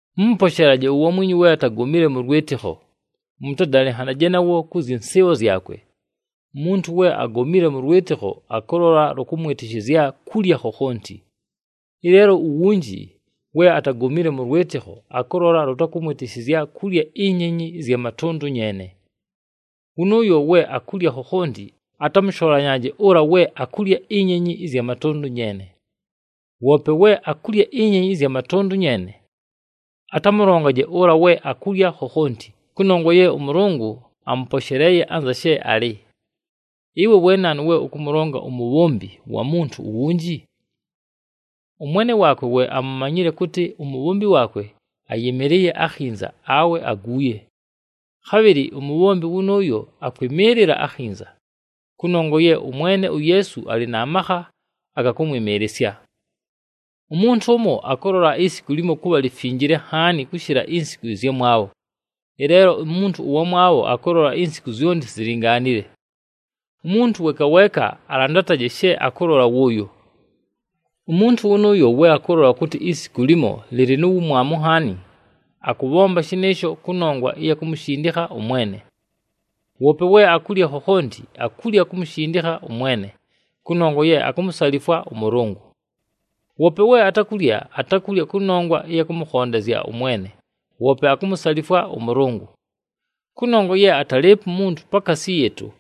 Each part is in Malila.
Mʉmʉposheelaje uwamwinyu we atagomile mʉ lwɨtɨkho. Mʉtadalɨnhanaje nawo kʉ zyɨ nsɨɨbho zyakwe. Umuntu we agomile mʉ lwɨtɨkho akʉlola lʉkʉmwɨtɨshɨzya kulya khokhonti. Ɨleelo uwunji we atagomile mʉ lwɨtɨkho, akʉlola lʉkʉmwɨtɨshɨzya kulya inyenyi ɨzya matʉndʉ nyeene. Wʉnʉʉyo we akulya khokhonti atamʉsholanyaaje ʉla we akulya inyenyi ɨzya matʉndʉ nyeene. Woope we akulya inyenyi ɨzya matʉndʉ nyeene, atamʉlongaje ʉla we akulya khokhonti, kʉnongwa ye ʉMʉlʉngʉ amʉposheleeye anza she alɨ. Ɨwe we naanu we ʉkʉmʉlonga umubhombi wa muntu uwunji? Ʉmwene waakwe we amumanyile kʉtɨ umubhombi waakwe ayɨmɨlɨɨye akhinza awe aguuye. Khabhɨlɨ umubhombi wʉnʉʉyo akwɨmɨɨlɨla akhinza, kʉnongwa ye ʉMwene uYeesu alɨ na makha aga kʉmwɨmɨɨlɨsya. Umuntu ʉmo akʉlola isiku limo kʉbha lifinjile nhaani kʉshɨla insiku ɨzyamwabho, ɨleelo umuntu ʉwamwabho akʉlola insiku zyonti zilingaanile. Umuntu weeka weeka alandataje she akʉlola wʉʉyo. Umuntu wʉnʉʉyo we akʉlola kʉtɨ isiku limo lɨlɨ nu wumwamu nhaani, akʉbhomba shɨnɨɨsho kʉnongwa ɨya kumushindikha ʉMwene. Woope we akulya khokhonti, akulya kumushindikha ʉMwene, kʉnongwa ye akumusalifwa ʉMʉlʉngʉ. Woope we atakulya, atakulya kʉnongwa ɨya kʉmʉkhondezya ʉMwene, woope akumusalifwa ʉMʉlʉngʉ. Kʉnongwa ye atalɨɨpo umuntu pakaasi yɨɨtʉ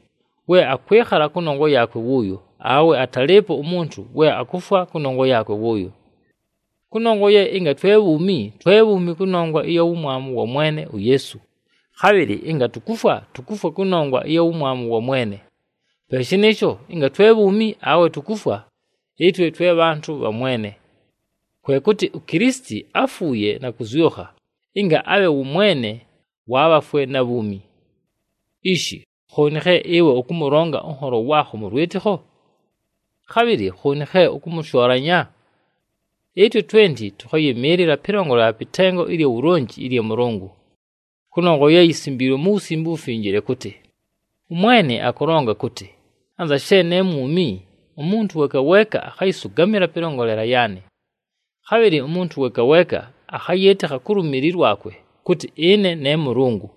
we akwɨkhala kʉnongwa yaakwe wʉʉyo, awe atalɨɨpo umuntu we akufwa kʉnongwa yaakwe wʉʉyo. Kʉnongwa ye ɨnga twe bhuumi, twe bhuumi kʉnongwa ɨya wumwamu wa Mwene uYeesu, khabhɨlɨ ɨnga tukufwa, tukufwa kʉnongwa ɨya wumwamu wa Mwene. Pe shɨnɨɨsho, ɨnga twe bhuumi awe tukufwa, ɨtwe twe bhantʉ bha Mwene. Kwe kʉtɨ, uKilisiti áfuuye na kʉzyʉkha, ɨnga abhe wʉ Mwene wa bhafwe na bhuumi. Ishi khooni khe ɨwe ʉkʉmʉlonga ʉnholo waakho mʉ lwɨtɨkho? Khabhɨlɨ khooni khe ʉkʉmʉshoolanya? Ɨtwe twenti tʉkhayɨmɨɨlɨla pɨlongolela pɨ tengo ɨlya wulonji ɨlya Mʉlʉngʉ. Kʉnongwa ye yisimbiilwe mu Wusimbe uWufinjile kʉtɨ, “ɄMwene akʉlonga kʉtɨ, ‘Anza she ne mwumi, umuntu weeka weeka akhayɨsʉgamɨla pɨlongolela yaanɨ. Khabhɨlɨ umuntu weeka weeka akhayɨɨtɨkha ku lumili lwakwe kʉtɨ ɨne ne Mʉlʉngʉ.’”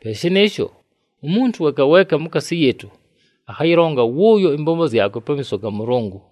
Pe shɨnɨɨsho, umuntu weeka weeka mukaasi yɨɨtʉ, akhayɨlonga wʉʉyo ɨmbombo zyakwe pamiiso ga Mʉlʉngʉ.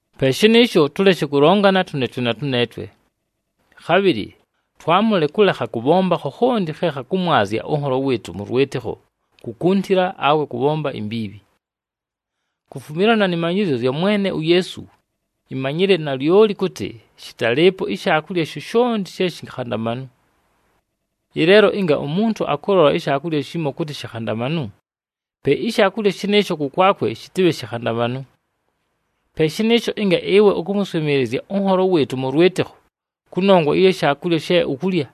Pe shɨnɨɨsho, tʉleshe kʉlongana tʉneetwe na tʉneetwe. Khabhɨlɨ twamʉle kʉlekha kʉbhomba khokhonti khe khakʉmwazya ʉnholo wɨɨtʉ mʉ lwɨtɨkho kukuntila awe kʉbhomba imbiibhi. Kufumilana nɨ manyɨzyo zya Mwene uYeesu, imanyile nalyoli kʉtɨ shɨtalɨɨpo ishaakulya shoshonti she shikhandamanu. Ɨleelo ɨnga umuntu akʉlola ishaakulya shimo kʉtɨ shikhandamanu, pe ishaakulya shɨnɨɨsho kʉkwakwe shɨtɨbhe shikhandamanu. Pe shɨnɨɨsho, ɨnga ɨwe ʉkʉmʉswɨmɨɨlɨzya ʉnholo wɨɨtʉ mʉ lwɨtɨkho kʉnongwa ɨya shaakulya she ukulya,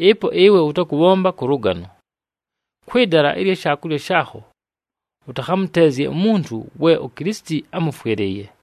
ɨpo ɨwe ʉtakʉbhomba kʉ lʉgano. Kwɨ dala ɨlya shaakulya shaakho ʉtakhamʉteezye umuntu we uKilisiti ámʉfwɨlɨɨye!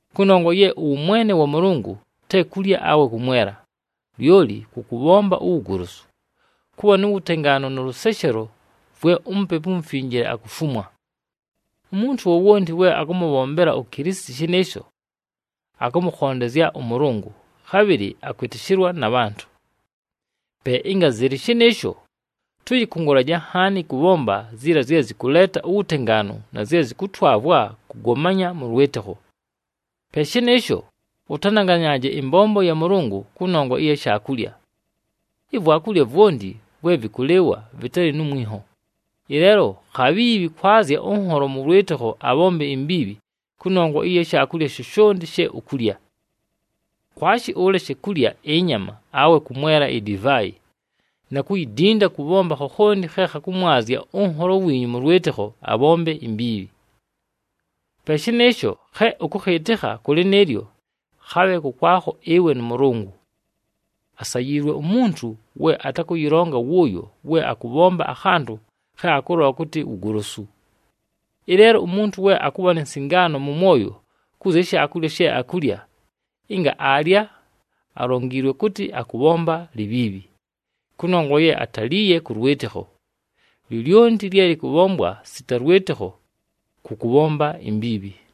Kʉnongwa ye ʉwʉmwene wa Mʉlʉngʉ te kulya awe kʉmwela, lyoli kʉ kʉbhomba uwugolosu, kʉbha nu wutengaanu nʉ lʉseshelo vwe uMupepu uMufinjile akufumwa. Umuntu wowonti we akʉmʉbhombela uKilisiti shɨnɨɨsho, akʉmʉkhondezya ʉMʉlʉngʉ, khabhɨlɨ akwɨtɨshɨlwa na bhantʉ. Pe ɨnga zɨlɨ shɨnɨɨsho, tʉyɨkʉngʉlaje nhaani kʉbhomba ziila zye zɨkʉleeta uwutengaanu na zye zɨkʉtwavwa kʉgomanya mʉ lwɨtɨkho. Pe shɨnɨɨsho, ʉtananganyaaje ɨmbombo ya Mʉlʉngʉ kʉnongwa ɨya shaakulya. Ivwakulya vwonti vwe vɨkʉlɨɨwa vɨtalɨ nu mwinho, ɨleelo khabhiibhi kwazya ʉnholo mʉ lwɨtɨkho abhombe imbiibhi kʉnongwa ɨya shaakulya shoshonti she ukulya. Kwashi ʉleshe kulya ɨnyama, awe kʉmwela idivaayi, na kuyidinda kʉbhomba khokhonti khe khakʉmwazya ʉnholo wiinyu mʉ lwɨtɨkho abhombe imbiibhi. Pe shɨnɨɨsho, khe ʉkʉkhɨɨtɨkha kʉ lɨnɨɨlyo, khabhe kʉkwakho ɨwe nʉ Mʉlʉngʉ. Asayiilwe umuntu we atakʉyɨlonga wʉʉyo we akʉbhomba akhantʉ khe akʉlola kʉtɨ wugolosu. Ɨleelo umuntu we akʉbha ni nsingaano mʉ mwoyo kʉ zya shaakulya she akulya, ɨnga aalya, alongiilwe kʉtɨ akʉbhomba libhiibhi, kʉnongwa ye ataliiye kʉ lwɨtɨkho. Lyolyonti lye lɨkʉbhombwa sita lwɨtɨkho kʉ kʉbhomba imbiibhi.